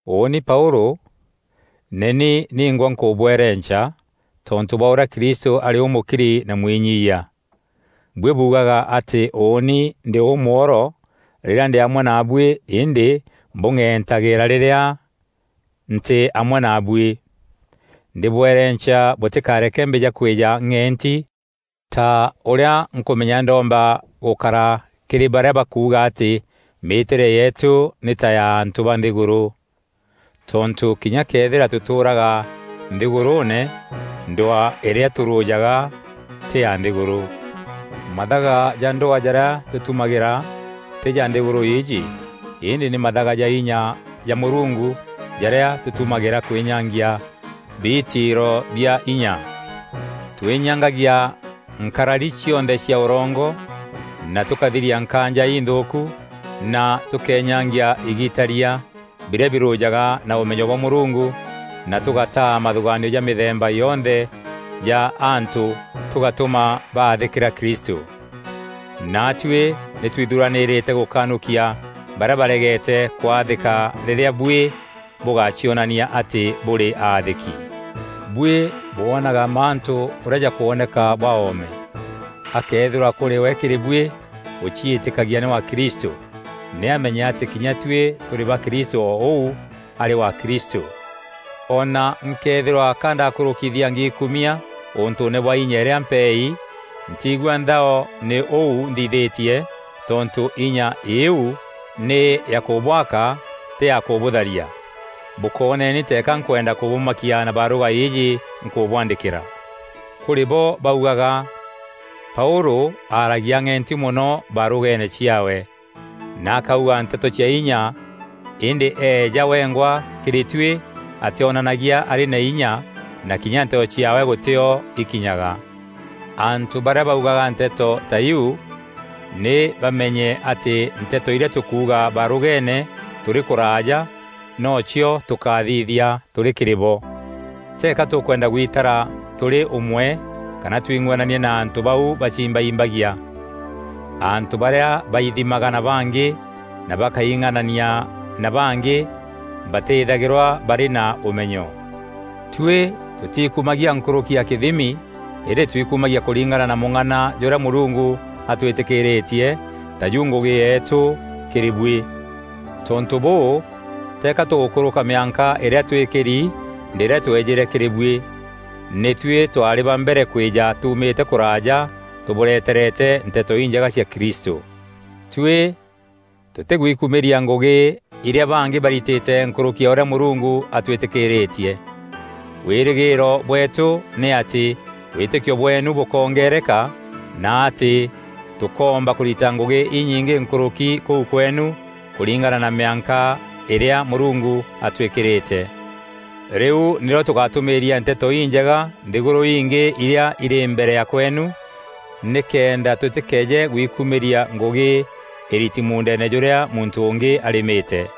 Ûûni Paûlû, nî ni ningwa nkûbwerenca, tontû bwa ûrîa Kristû arî ûmûkiri na mwinyiiyia. Buî buugaga atî ûûni ndî ûmworo rîrîa ndî amwe naabuî îndî mbûng'entagîîra rîrîa ntî amwe naabuî. Ndîbwerenca bûtîkareke mbîja kwîja ng'enti ta ûrîa nkûmenya ndomba gûkara kîrî barîa bakuuga atî mîîtîre yeetû nî ta ya antû ba nthîgûrû. Tontû kinya këethîra tûtûûraga nthîgûrûûne, ndwaa îrîa tûrûjaga tî ya nthîgûrû. Mathaga ja ndwaa jarîa tûtumagîra tî ja nthîgûrû îîjî îndî nî mathaga ja inya ja Mûrungu jarîa tûtumagîra kwînyangia biitiiro bia inya. Twînyangagia nkarari cionthe cia ûrongo na tûkathiria nkaanja inthûûku na tûkeenyangia igitaria birîa birûjaga na ûmenyo bwa Mûrungu na tûgataa mathûgaanio ja mîthemba yonthe ja antû tûgatûma baathîkîra Kristû. Naatuî nî twithuranîrîte gûkanûkia barîa baregeete kwaathîka rîrîa buî bûgacionania atî bûrî aathîki. Buî bwoonaga mantû ûrîa jakwoneka bwa oome. Akëethîrwa kûrî we kîrî buî ûciîtîkagia nî wa Kristû, nî ameenye atî kinya tuî tûrî ba Kristû o ûu arî wa Kristû. O na nkeethîrwa ka ndakûrûkithia ngiikumia ûntûûne bwa inya îrîa mpeei, ntiigua nthao nî ûu nthithîtie tontû inya iu nî ya kûbwaka tî ya kûbûtharia. Bûkooneni teeka nkwenda kûbûmakia na barûga îîjî nkûbwandîkîra. Kûrî bo baugaga, “Paûlû aaragia ang'enti mono barûgeene ciaawe, na akauga nteto cia inya îndî eeja wengwa kîrî tuî atîonanagia arî na inya na kinya nteto ciaawe gûtîo ikinyaga.” Antû barîa baugaga nteto ta iu nî bameenye atî nteto irîa tûkuuga barûgeene tûrî kûraaja nocio tûkathithia tûrî kîrî bo. Teeka tûkwenda gwitara tûrî ûmwe kana twing'anania na antû bau baciimbaimbagia. Antû barîa baithimaga na bangî na bakaing'anania na bangî batîthagîrwa barî na ûmenyo. Tuî tûtiikumagia nkûrûki ya kîthimi îndî twikumagia kûringana na mûng'ana jûrîa Mûrungu atwîtîkîîrîtie, taju ngûgî yeetû kîrî buî. Tontû bûû teeka tûgûkûrûka mîanka îrîa twîkîri, ndîrîa twejîre kîrî buî. Nî tuî twaarî ba mbere kwîja tuumîte kûraaja tûbûreterete Nteto Injega cia Kristû. Tuî tûtîgwikumîria ngûgî irîa bangî baritîte nkûrûki ya ûrîa Mûrungu atwîtîkîîrîtie. Wîrîgîîro bweetû nî atî wîtîkio bweenu bûkongeereka na atî tûkoomba kûrita ngûgî inyingî nkûrûki kûu kweenu, kûringana na mîanka îrîa Mûrungu atwîkîrîte. Rîu nîrîo tûgatûmîîria Nteto Injega nthîgûrû ingî irîa irî mbere ya kweenu nîkenda tûtîkeeje gwikumîria ngûgî îriti muundeene jûrîa muntû ûngî arîmîte.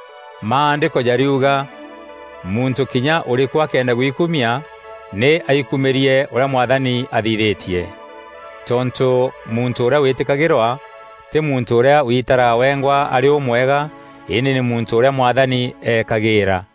Maandîko jariuga, “Muntû kinya ûrîkû akenda gwikumia, nî aikumîrie ûrîa Mwathani athithîtie.” Tontû muntû ûrîa wîtîkagîrwa tî muntû ûrîa witaraga wengwa arî ûmwega îndî nî muntû ûrîa Mwathani eekagîîra.